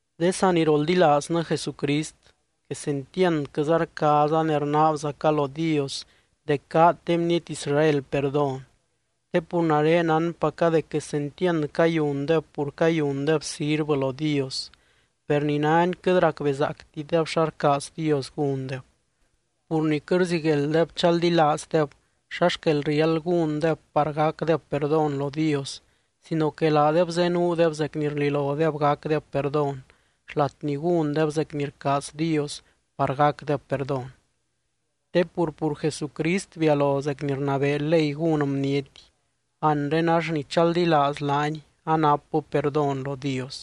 De saniroldilaaznɨ Jesucrist, quesentiandquɨza rcaaza ne rnaabzaca lo Dios dec gaad de bniety Israel perdón. Te pur nare nánpaca dec quesentiand cayundeb pur cayundeb sirvɨ lo Dios, per ni nani quɨt racbezaactideb xa rcaaz Dios gúndeb. Pur ni quɨt rziguelddeb chaldilaazdeb xa xquel riáld gúndeb par gacdeb perdón lo Dios sino que laadeb zenuudeb zec ni rlilodeb gacdeb perdón, xlat ni gúndeb zec ni rcaaz Dios par gacdeb perdón. Te pur, pur Jesucrist bialo zec ni rnabee ley gún bniety, anre ax ni chaldilaaz laany anapbɨ perdón lo Dios.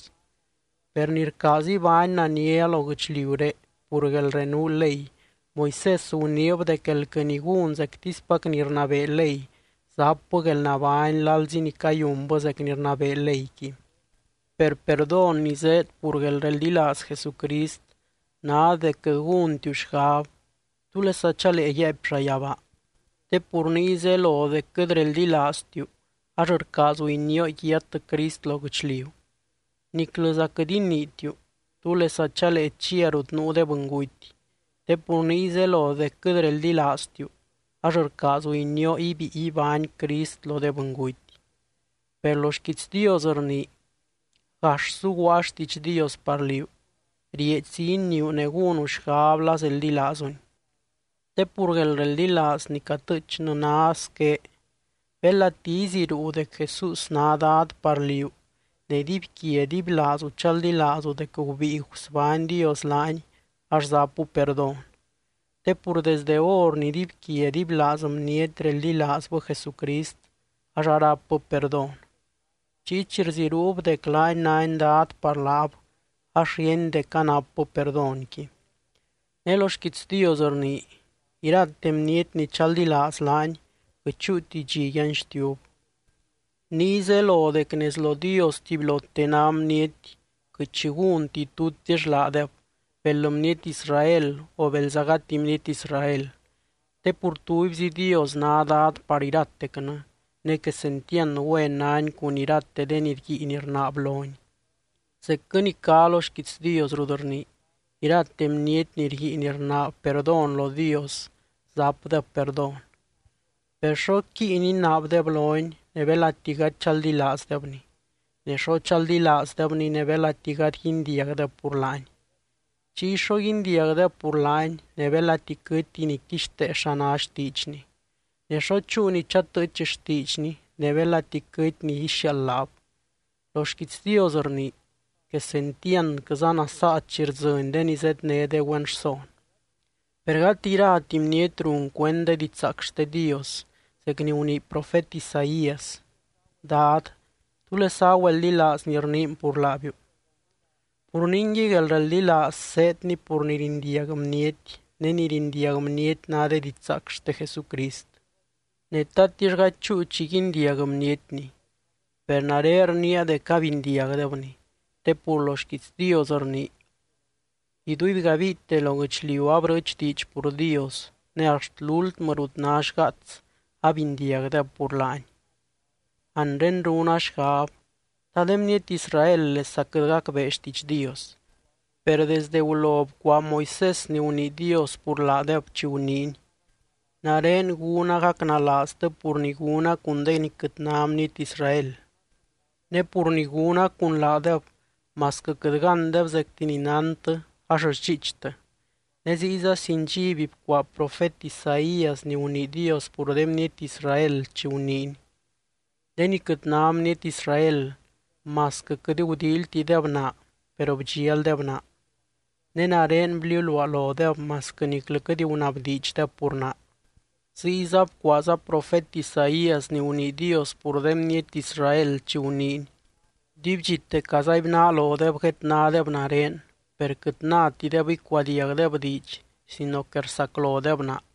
Per ni rcaaz ibány nania lo guɨchliuré pur guelrenuu ley, Moisés guniib dec elquɨ ni gún zectispac ni rnabee ley, zapbɨ guelnabány lalzi ni cayunbɨ zec ni rnabee leyqui. Per perdón ni zéed pur guelreldilaaz Jesucrist ná dec quɨt gúntiu xgab: “¿Túlesa chalee yaaipy llayabaa?” (Te pur niy zelo dec quɨt reldilaaztiu, ax rcaazu inioo yiat Crist lo guɨchliu.) Niclɨza quɨt iniitiu: “¿Túlesa chalee chia rut nuu de bɨnguty?” (Te pur niy zelo dec quɨt reldilaaztiu, ax rcaazu inioo ibíi ibány Crist lo de bɨnguty.) Per lo xquiits Dios rnii: “Gax zuguaa xtiidx Dios par liú, rieedxzi iniiu ne gúnu xgab la zeldilaazuni.” Te pur guelreldilaaz ni catɨɨchnɨ ná squé: Belati iziruu dec Jesús ná Dad par liú ne dibyquia dibylaazu chaldilaazu dec gubíi gusbány Dios laany, ax zapu perdón. Te pur desdɨ hor ni dibyquia dibylaaz bniety reldilaazbɨ Jesucrist ax arápbɨ perdón. Chiy chi rziruub dec laany nány Dad par laab ax ríeny dec anapbɨ perdónqui. Ne lo xquiits Dios rnii: “Irate bniety ni chaldilaaz laany quɨt chúuti dxi yanxtiub.” Niy zelo dec nez lo Dios tubylote ná bniety quɨt xi gúnti tutix laadeb, bel bniety Israel o belza gati bniety Israel. Te pur tubyzi Dios ná Dad par iratecnɨ, ne quesentiand güen nány cun irate de ni rguiin rnaab lony. Zecquɨ ni cá lo xquiits Dios rut rnii: “Irate bniety ni rguiin rnaab perdón lo Dios, zapdeb perdón.” Per, ¿xo quíin inaabdeb lony ne belati gady chaldilaazdebny? Ne, ¿xo chaldilaazdebny ne belati gady guindiagdeb pur laany? Chiy, ¿xo guindiagdeb pur laany ne belati quɨtti ni quixtee xa ná xtiidxny? Ne, ¿xo chúu ni chatɨɨch xtiidxny ne belati quɨty ni ixiaald laab? Lo xquiits Dios rnii: “¡Quesentiandquɨza nasaa chi rdzɨny de ni zédne de güen rson!” Per gati irati bniety run cuend de didxzaac xte Dios, zec ni gunii profet Isaías: “Dad, ¿túlesa agüeldilaaz ni rniin pur laabiu?” Pur ningui guelreldilaaz zéedni pur ni rindiag bniety, ne ni rindiag bniety ná de didxzaac xte Jesucrist. Ne, ¿tatix gady chúu chi guindiag bnietni? ¡Per nare rniia dec abindiagdebni! Te pur lo xquiits Dios rnii: Iduibgabiite lo guɨchliu abrɨɨch diidx pur Dios ne axt lúltmɨ rut ná xgaats abindiagdeb pur laany. Anre runa xgab: ¿Ta de bniety Israel lesa quɨt gacbee xtiidx Dios? Per desde gulo bcuaa Moisés ni gunii Dios pur laadeb chi guniiny: Nare gúna gacnalaaztɨ pur ni gúna cun de ni quɨt ná bniety Israel, ne pur ni gúna cun laadeb masquɨ quɨt gándeb zecti ni nántɨ ax sdxiichtɨ. Ne ziyza sin dxiby bcuaa profet Isaías ni gunii Dios pur de bniety Israel chi guniiny: De ni quɨt ná bniety Israel masquɨ quɨt gudíilytideb naa, per bdxialdeb naa. Ne nare bliuluaa lodeb masquɨ niclɨ quɨt gunabdiidxdeb pur naa. Ziyza bcuaaza profet Isaías ni gunii Dios pur de bniety Israel chi guniiny: “Dibydxite cazaibnaa lodeb guednádeb nare, per quɨt nátideb icuadiagdeb diidx sino que rsaclodeb naa.”